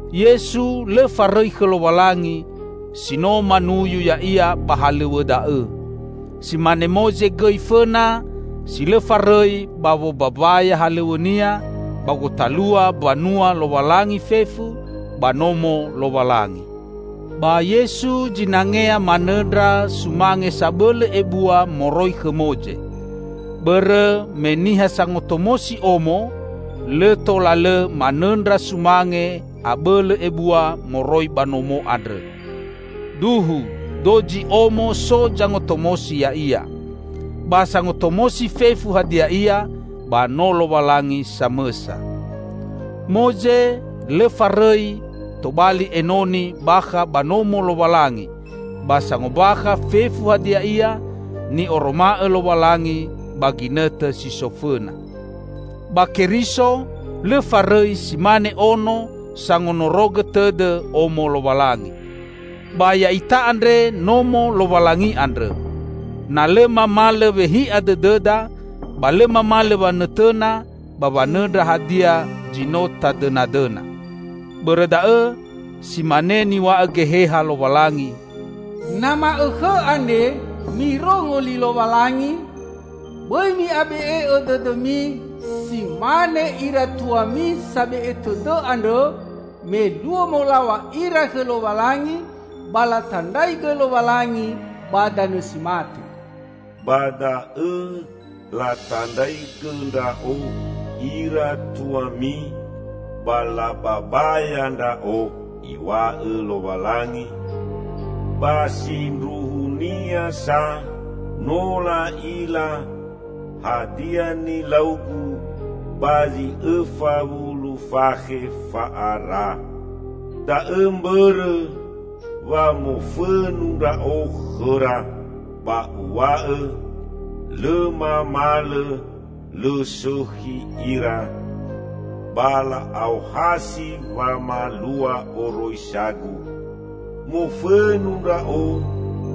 Yesu lõ farõi khõ Lowalangi si no manuyu Ya'ia ba halõw̃õ da'õ. Si mane Moze gõi fõna si lõ farõi ba wombambaya halõw̃õnia ba gotalua Mbanua Lowalangi fefu, ba Nomo Lowalangi. Ba Yesu zinangea manõndra sumange sabõlõ ebua moroi khõ Moze. Bõrõ me niha sangotomosi omo lõ tola lõ manõndra sumange abõlõ ebua moroi ba nomo andrõ. Duhu dozi omo so zangotomosi ya'ia. Ba sangotomosi fefu hadia ia, ba no Lowalangi samõsa. Moze lõ farõi tobali enoni bakha ba Nomo Lowalangi ba sangombakha fefu hadia ia ni'oroma'õ Lowalangi ba ginõtõ si so fõna. Ba Keriso lõ farõi si mane Ono sangonorogõ tõdõ Omo Lowalangi. Ba ya'ita andre Nomo Lowalangi andrõ, na lõ mamalõ wehi'a dõdõda ba lõ mamalõ wanõtõna ba wanõndra hadia zi no tadõnadõna. Bõrõ da'õ, si mane niw̃a'õ Geheha Lowalangi, "Na ma'õkhõ andre mirongo li Lowalangi, bõi mi'abe'e'õ dõdõmi, si mane ira tuami sabe'e tõdõ andrõ me luo molaw̃a ira khõ Lowalangi, ba latandraigõ Lowalangi ba danõ si mate. 'Ba da'õ latandraigõ Ndra'o ira tuami ba lababaya Ndra'o,' Iw̃a'õ Lowalangi, 'ba sindruhunia sa no la'ila hadia nilau-Gu ba zi õfa wulu fakhe fa'ara.' Da'õ mbõrõ wa mofõnu Ndra'o khõra, ba Uw̃a'õ, 'Lõ mamalõ lõ sõkhi ira, ba la'aohasi wamalua oroisa-Gu.' Mofõnu Ndra'o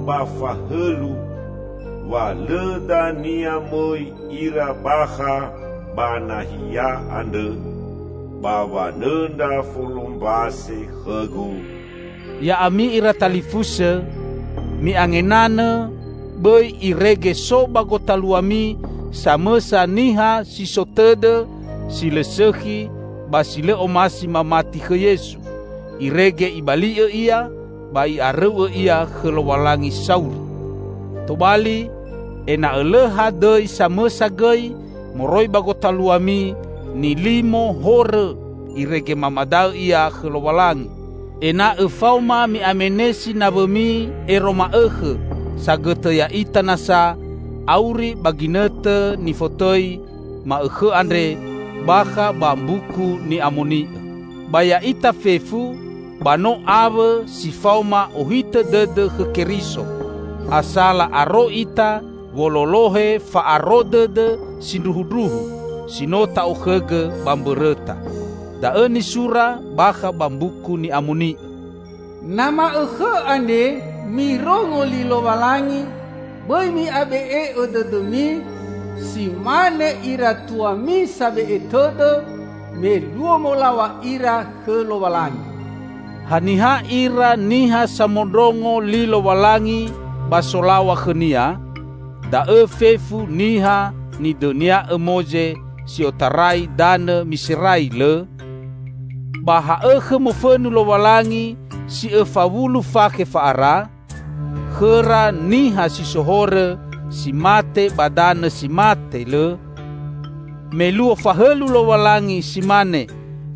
ba fahõlu, 'Wa lõ dania mõi ira bakha ba nahia andrõ, ba wanõndra folombase khõ-Gu!'" Ya'ami ira talifusõ, mi'angenanõ bõi irege so ba gotaluami samõsa niha si so tõdõ si lõ sõkhi ba si lõ omasi mamati khõ Yesu, irege ibali'õ ia ba i'arõu'õ ia khõ Lowalangi sauri! Tobali, ena'õ lõ hadõi samõsa gõi moroi ba gotaluami nilimo horõ irege mamadaõ ia khõ Lowalangi, ena'õ faoma mi'amenesi nawõmi ero ma'õkhõ sagõtõ ya'ita nasa auri ba ginõtõ nifotõi "Ma'õkhõ andre" bakha ba Mbuku Ni'amoni'õ. Ba ya'ita fefu ba no awõ si faoma ohitõ dõdõ khõ Keriso; asala aro ita wololohe fa'aro dõdõ sindruhundruhu si no ta'okhõgõ ba mbõrõta. Da'õ nisura bakha ba Mbuku Ni'amoni'õ, "Na ma'õkhõ andre mirongo li Lowalangi bõi mi'abe'e'õ dõdõmi, si mane ira tuami sabe'e tõdõ, me luo molaw̃a ira khõ Lowalangi." Haniha ira niha samondrongo li Lowalangi ba solaw̃a khõ-Nia? Da'õ fefu niha nidõnia'õ Moze si otarai danõ Miserai, lõ? Ba ha'õkhõ mofõnu Lowalangi si õfa wulu fakhe fa'ara? Khõra niha si so horõ, si mate ba danõ si mate, lõ? Me luo fahõlu Lowalangi si mane,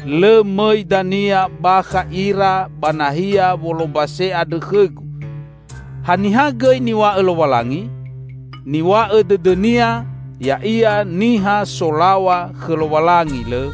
"Lõ mõi dania bakha ira ba nahia wolombase andrõ khõ-Gu" -- haniha gõi niw̃a'õ Lowalangi? Niw̃a'õ dõdõ-Nia ya'ia niha solaw̃a khõ Lowalangi, lõ?